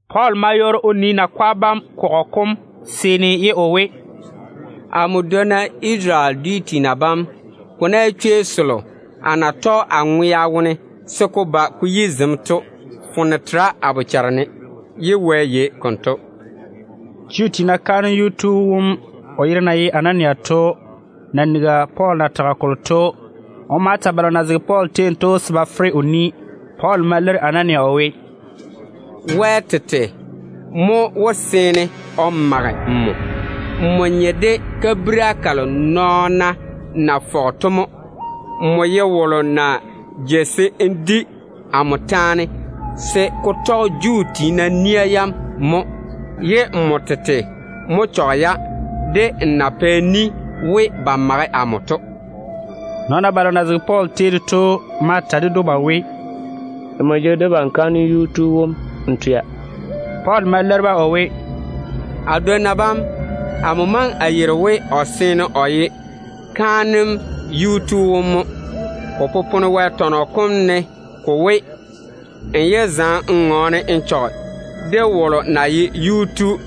Pɔɔl ma yɔɔre o nii nakwa bam kɔgɔ kom seeni ye o we, “Amo dwonna Isarele dwi tiina bam, ko ná ye chwei selo a na tɔge a ŋwea wone se ko ba ko yi zem to, foone tera a bochare ne, ye Wɛ yei konto.” Juu tiina kaanem yuu tu wom, o yere na ye Anania to, na nigi Pɔɔl na tage kolo to, o ma ta balo na zege Pɔɔl tei ne to se ba fere o ni. Pɔɔl ma leiri Anania o we, “Wɛ tete mo wó seene o mage nmo. Nmo nye de kabira kalo nɔɔna na fɔge to mo. Nmo ye wolo na jei se n di amo taane se ko tɔge Juu tiina nia yam mo, ye nmo tete mo chɔge-ya de n na pɛ ni we ba mage amo to.” Nɔɔna balo na zege Pɔɔl tei ne to ma ta ded‑o ba we, “Nmo jege debam kaanem yuu tu wom n twea!” Pɔɔl ma leiri-ba o we, “A dwonna bam, amo maŋe a yeiri we o seene o ye kaanem yuu tu wom mo. Ko popone Wɛ tɔnɔ kom ne ko we, n yé zaŋe n ŋɔɔne n chɔge wolo na ye yuu tu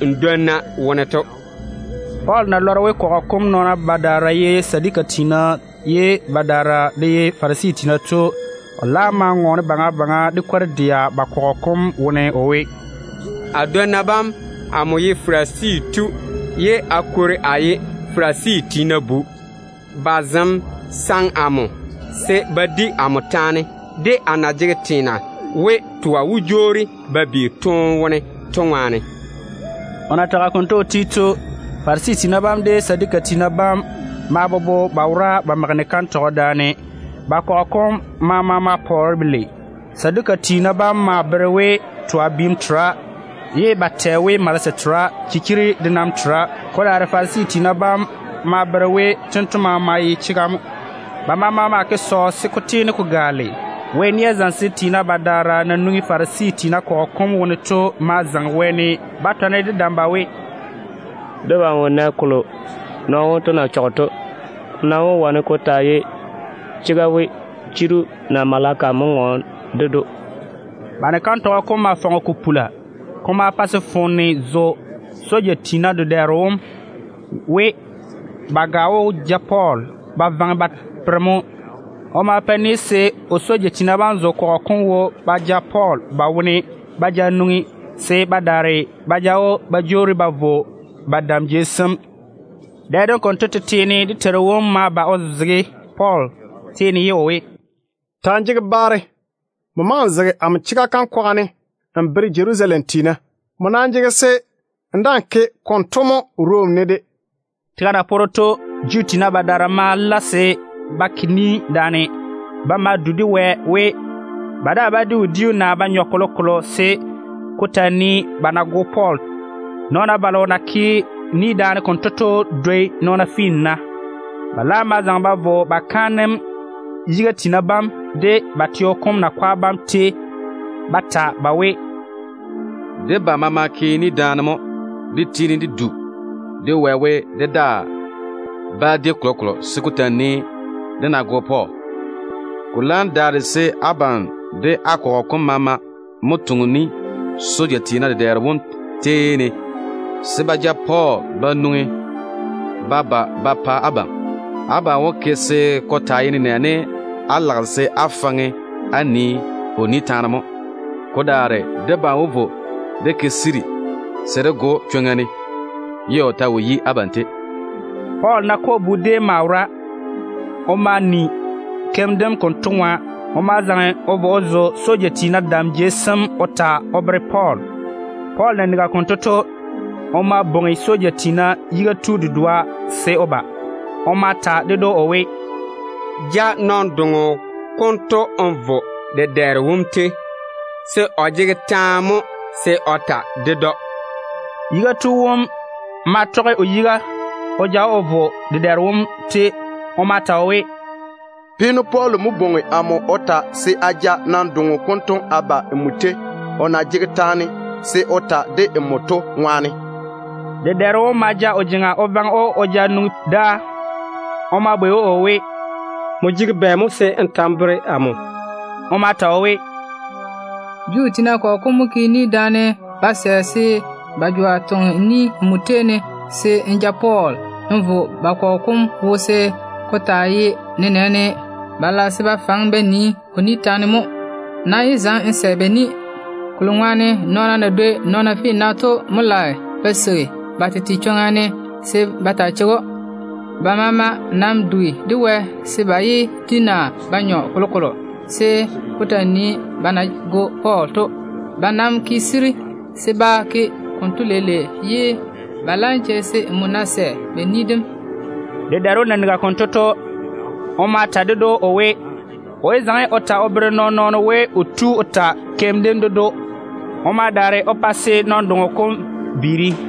n dwonna wone to yiga.” Pɔɔl na lɔre we kɔgɔ kom nɔɔna badaara ye Saduka tiina, ye badaara de ye Farisi tiina to, o laam ma ŋɔɔne baŋa baŋa de kwor-dɛa ba kɔgɔ kom wone o we, “A dwonna bam, amo ye Farisi tu ye a kwori a ye Farisi tiina bu. Ba zem saŋe amo se ba di amo taane de a na jege teena we twa wó jwoori ba bi toone wone to ŋwaane.” O na tage konto o ti to, Farisi tiina bam de Saduka tiina bam ma bobo se ba mage ni-kantɔgɔ daane. Ba kɔgɔ kom maama ma pɔɔre belei. Kokuri to Saduka tiina bam bere we twa biim tera, ye ba tɛ we malese tera, chira de nam tera. Ko daare Farisi tiina bam maa bere we tento maama ye chega mo. Ba maama ma ke sɔɔ se ko tiini ko gaale. Wɛ nia zamesem tiina badaara na nwoŋi Farisi tiina kɔgɔ kom wone to ma zaŋe wɛɛne ba tɔne de dam ba we, “Debam wo nɛ kolo nɔɔno wonto na ke o chɔge to. Ko nam wó wane ko taa ye chega we chiru naa maleka mo ŋɔɔne ded‑o.” Ba ni-kantɔgɔ kom maa fɔge ko pula. Ko ma pa se foone zo soja tiina dedɛɛro wom we ba ga wó ja Pɔɔl ba vaŋe ba tore mo. O ma pa ni se o soja tiina bam zo kɔgɔ kom wo ba ja Pɔɔl ba wone ba ja nwoŋi, se ba daare ba ja‑o ba jwoori ba vo ba dam jei sem. Dɛ dem konto tete ne dé Teiru wom ma ba o zege Pɔɔl tei ne ye o we, “Ta‑n jege baare. Nmo maŋe n zege amo chega kam kwaga ne n bere Jerusalem tiina. Nmo nam jege se n daa‑n ke konto mo Rom teo ne de.” Tega na poore to, Juu tiina badaara ma la se ba ke ni daane. Ba ma du de Wɛ we ba daa bá di wodiu naa ba nyɔ kolokolo se ko ta nii ba ná go Pɔɔl. Nɔɔna balo na ke ni daane konto to dwoi nɔɔna finna. Ba laam ma zaŋe ba vo ba kaanem yiga tiina bam de ba teo kom nakwa bam tei ba ta ba we, “Debam maama ke ni daane mo dé tiini dé du de Wɛ we, dé daa bá di kolokolo se ko taa nii dé ná go Pɔɔl. Ko laam daare se abam de á kɔgɔ kom maama mo toŋe ni soja tiina dedɛɛro wom tei ne se ba ja Pɔɔl ba nwoŋi ba ba ba pa abam. Abam wó ke se ko taa ye nenɛɛne á lage se á faŋe á nii o ni taane mo. Ko daare debam wó vo dé ke siri se dé go‑o chwoŋa ne ye o ta wo yi abam tei.” Pɔɔl nakɔ bu déem maa wora. O ma ni keim dem konto ŋwa. O ma zaŋe o vo o zo soja tiina dam jei sem o ta o bere Pɔɔl. Pɔɔl na nigi konto to, o ma bwoŋi soja tiina yiga tu dedoa se o ba. O ma ta ded‑o o we, “Ja nɔn-doŋo konto n vo n dedɛɛro wom tei, se o jege taane mo se o ta ded‑o.” Yiga tu wom ma tɔge o yiga o ja‑o o vo dedɛɛro wom tei. O ma ta o we, “Pɔɔl na ye peeno to mo bwoŋi amo o ta se a ja nɔn-doŋo konto a ba nmo tei, o na jege taane se o ta de nmo to ŋwaane.” Dedɛɛro wom ma ja o jeŋa o vaŋe‑o o ja nwoŋi dáa. O ma bwei‑o o we, “Nmo jege bɛ mo se n ta n bere-ne?” O ma ta o we, “Juu tiina kɔgɔ kom mo ke ni daane ba sɛ se ba jwa toŋe ni nmo tei ne se n ja Pɔɔl n vo ba kɔgɔ kom wo se ko taa ye nenɛɛne ba lage se ba faŋe ba nii o ni taane mo. Nam yé zaŋe n sɛ ba ni, kolo ŋwaane nɔɔna na dwoi nɔɔna finna to mo lage ba seigi ba tete chwoŋa ni ne se ba taa cheigi‑o. Ba maama nam dugi de Wɛ se ba yé di naa ba nyɔ kolokolo se ko taa nii ba na wó go Pɔɔl maŋa kalo to. Ba nam ti yiga mo se ba ke konto leile, ye ba laam cheigi se nmo ná sɛ ba ni dem.” Dedɛɛro wom na nigi konto to, o ma ta ded‑o o we, o yé ta o bere nɔɔn-nɔɔno we o tu o ta keim dem o bere‑o. O ma daare o pa se nɔn-doŋo kom viiri.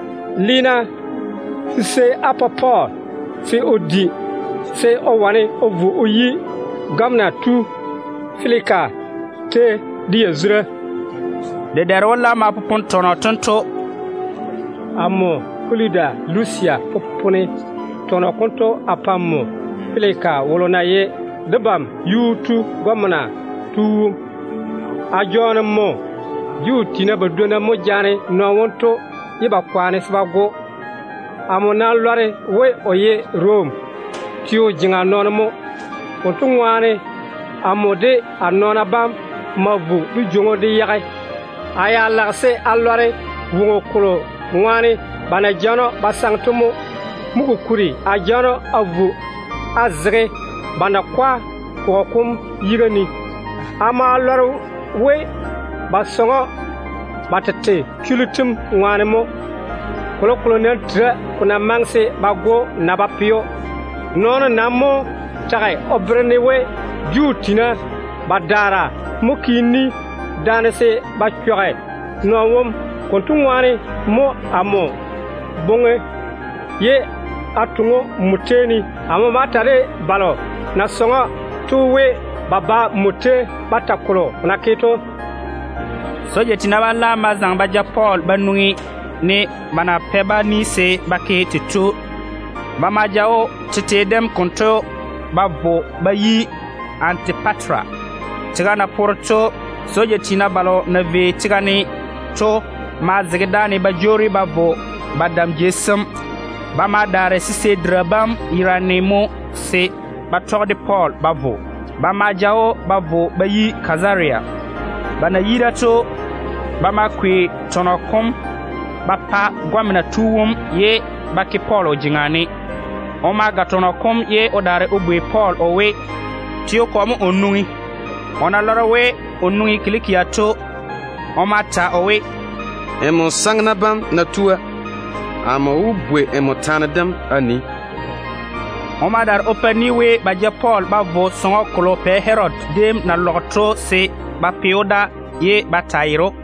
Le-na sisei á pa Pɔɔl se o di, se o de wane o vo o yi gɔmena tu Feliki tei de yazura.” Dedɛɛro wom laam ma popone tɔnɔ tento: “Amo Kaludu Lusia popone tɔnɔ konto a pa nmo Feliki wolo na ye debam yuu tu gɔmena tu wom. A jɔɔne nmo. Juu tiina badwonna mo jaane nɔɔno wonto ye ba kwaane se ba go‑o. Amo nam lɔre we o ye Rom teo jeŋa nɔɔno mo. Konto ŋwaane amo de a nɔɔna bam ma vo dé jwoŋi‑o dé yage. A ya lage se a lɔre woŋo kolo ŋwaane ba na jaane‑o ba saŋe to mo. Mo kokuri a jaane‑o a vo a zege ba nakwa kɔgɔ kom yiga ne. A ma lɔre we ba saŋe‑o ba tete chullu tem ŋwaane mo. Kolokolo nam tera ko na maŋe se ba go‑o naa ba pe‑o. Nɔɔno nam mo tage o bere-ne we Juu tiina badaara mo ke ni daane se ba chɔge nɔɔno wom. Konto ŋwaane mo amo boŋe ye a toŋe‑o nmo tei ne. Amo ma ta de balo na saŋe‑o to we, ba ba nmo tei ba ta kolo na ke to.” Soja tiina bam laam ma zaŋe ba ja Pɔɔl ba nwoŋi, ne ba na pɛ-ba ni se ba ke tei to. Ba ma ja‑o tete dem konto ba vo ba yi Antipatera. Tega na poore to, soja tiina balo na vei tega ne to ma zege dáane ba jwoori ba vo ba dam jei sem. Ba ma daare sisei dira bam yerane mo se ba tɔge de Pɔɔl ba vo. Ba ma ja‑o ba vo ba yi Kazaria. Ba na yi da to, ba ma kwei tɔnɔ kom ba pa gɔmena tu wom ye ba ke Pɔɔl o jeŋa ne. O ma ga tɔnɔ kom ye o daare o bwei Pɔɔl o we, teo kɔ mo o nwoŋi? O na lɔre we o nwoŋi Kilikia to, o ma ta o we, “Nmo saŋena bam ná tua, amo wó bwei nmo taane dem a nii.” O ma daare o pa ni we ba ja Pɔɔl ba vo sɔŋɔ kolo Pɛ Herodi déem na lɔge to se ba pe‑o da ye ba taa yere‑o.